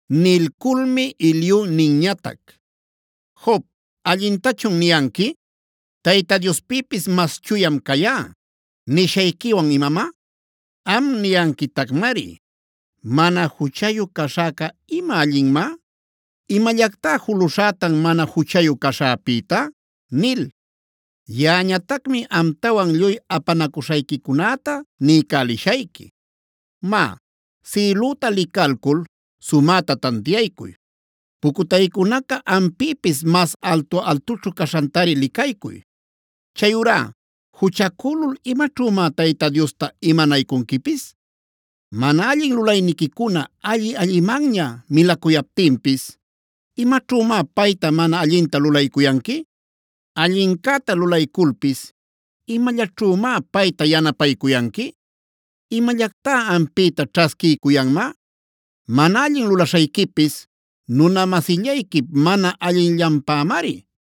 Nilculmi Eliu ninñatac: “Job, ¿allintachun niyanqui: ‘Tayta Diospïpis mas chuyam cayá’ nishayquiwan imamá? Am niyanquitacmari: ‘¿Mana juchayu caśhäca ima allinmá? ¿Imallactá juluśhätan mana juchayu caśhäpïta?’ “Yaꞌañatacmi amtawan lluy apanacuśhayquicunäta niycälishayqui. Má, sïlüta licalcul sumäta tantiaycuy; pucutaycunaca ampïpis mas altu-altućhu caśhantari licaycuy. Chayurá ¿juchacülul imaćhümá Tayta Diosta imanaycunquipis? Mana allin lulayniquicuna alli-allimanña milacuyaptinpis, ¿imaćhümá payta mana allinta lulaycuyanqui? Allincäta lulayculpis ¿imallaćhümá payta yanapaycuyanqui? ¿Imallactá ampïta ćhasquiycuyanmá? Mana allin lulaśhayquipis nuna-masillayquip mana allinllanpämari;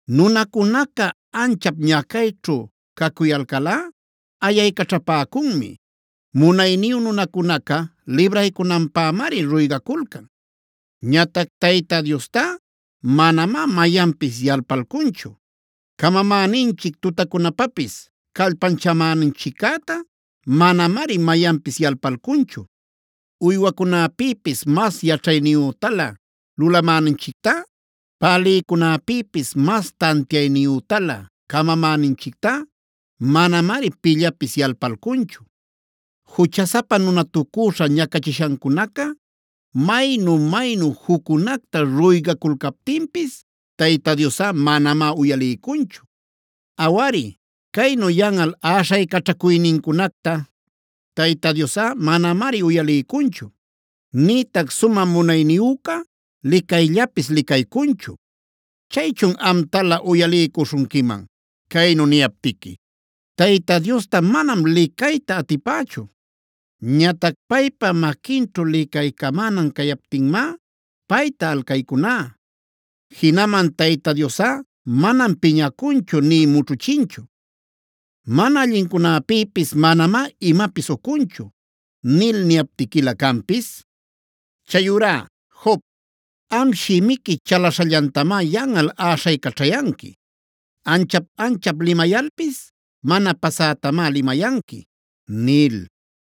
“Nunacunaca anchap ñacayćhu cacuyalcalꞌa ayaycaćhapäcunmi; munayniyu nunacunaca libraycunanpämari ruygaculcan. Ñatac Tayta Diostá manamá mayanpis yalpalcunchu; camamäninchic tutacunapapis callpanchamäninchiccätá manamari mayanpis yalpalcunchu. Uywacunäpïpis mas yaćhayniyütalä lulamäninchictá, pälïcunäpïpis mas tantiayniyütalä camamäninchictá manamari pillapis yalpalcunchu. Juchasapa nunatucüśha ñacachishancunaca maynu-maynu juccunacta ruygaculcaptinpis, Tayta Diosꞌa manamá uyaliycunchu. Awari, caynu yanꞌal äśhaycaćhacuynincunacta Tayta Diosꞌa manamari uyaliycunchu; nïtac sumä munayniyüca licayllapis licaycunchu. Chaychun amtalä uyaliycuśhunquiman, caynu niyaptiqui: ‘Tayta Diosta manam licayta atipächu. Ñatac paypa maquinćhu licaycamänan cayaptinmá payta alcaycuná. Jinaman Tayta Diosꞌa manam piñacunchu nï mućhuchinchu. Mana allincunäpïpis manamá imapis ucunchu’ nil niyaptiquilä canpis. Chayurá Job, am shimiqui chalaśhallantamá yanꞌal äśhaycaćhayanqui; ancha-anchap limayalpis mana pasätamá limayanqui” nil.